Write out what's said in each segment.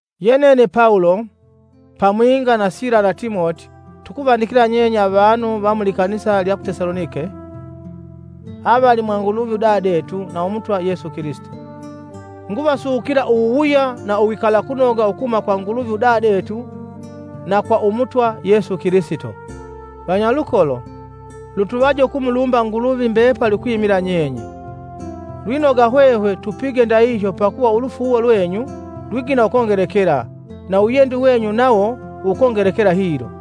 Yenene Pawulo, pamwinga na Sila na Timoti tukuvandikila nyenye avanu va mu likanisa lya ku Tesalonike, ve avanu vakwe Nguluvi udadetu na va Umutwa Yesu Kilisito. Nguvasukila uwuwuya na uwikalakunoga ukuhuma kwa Nguluvi udadetu na kwa Umutwa Yesu Kilisito. Vanyalukolo, lutuvaje ukumulumba Nguluvi mbepali ukwimila nyenye. Lwinoga hwehwe tupige ndahihyo pakuva ulufuuwo lwenyu lwigina ukongelekela na uwiyendi wenyu nawo wukongelekela hilo.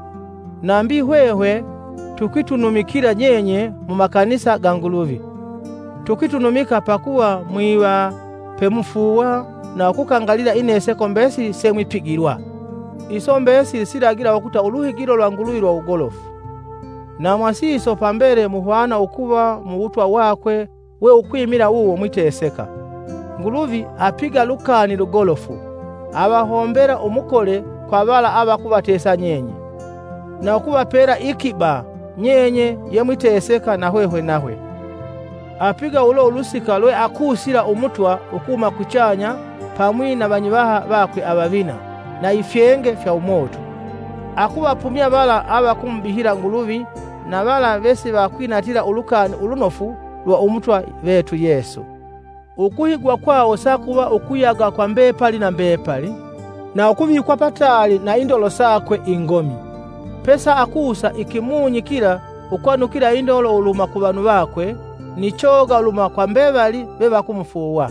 Nambi hwehwe tukwitunumikila nyenye mumakanisa ga Nguluvi. Tukwitunumika pakuva mwiva pemufuuwa na ukukangalila Ineseko mbesili semwipigilwa. Iso mbesili silagila ukuta uluhigilo lwa Nguluvi lwa wugolofu, na mwasiso pambele muhwana ukuva mu wutwa wakwe we ukwimila wuwo mwiteseka. Nguluvi apiga lukani lugolofu; avahombela umukole kwa vala avakuvatesa nyenye, na ukuvapela iikiba nyenye ye mwiteseka na hwehwe nahwe. Apiga ulo ulusika lwa ukusila Umutwa ukuhuma kuchanya pamwi na vanyivaha vakwe avavina na ifyenge fya umoto, ukuvapumya vala avakumubihila Nguluvi na vala vesivakwinatila Ulukani Ulunofu lwa Umutwa vetu Yesu. Ukuhigwa kwawo sakuva ukuyaga kwa mbepali na mbepali na ukuvikwa pataali na indolo yakwe ingomi, pesaakusa Ikimunyi kila ukwanukila indolo uluhuma kuvanu vakwe, ni choga uluhuma kwa mbevali vevakumufuuwa.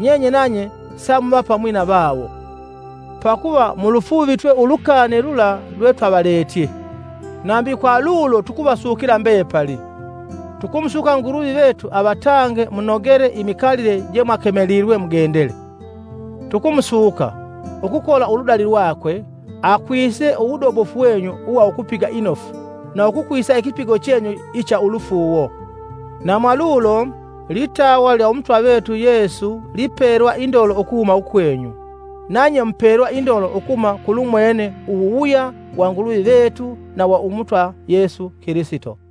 Nyenye nanye samuva pamwi na vawo, pakuva mulufuuvitwe ulukani lula lwe twavaletye. Nambi kwa lulo tukuvasukila mbepali. Tukumusuka Nguluvi vetu avatange munogele imikalile je mwakemelilwe mugendele. Tukumusuka, ukukola uludali lwakwe, akwise uwudobofu wenyu uwa ukupiga inofu na ukukwisa ikipigo chenyu icha ulufuuwo. Na mwalulo, litawa lya Umutwa vetu Yesu ipelwa indolo ukuhuma ukwenyu, nanye mupelwa indolo ukuhuma kulumwene uwuwuya wa Nguluvi vetu na wa Umutwa Yesu Kilisito.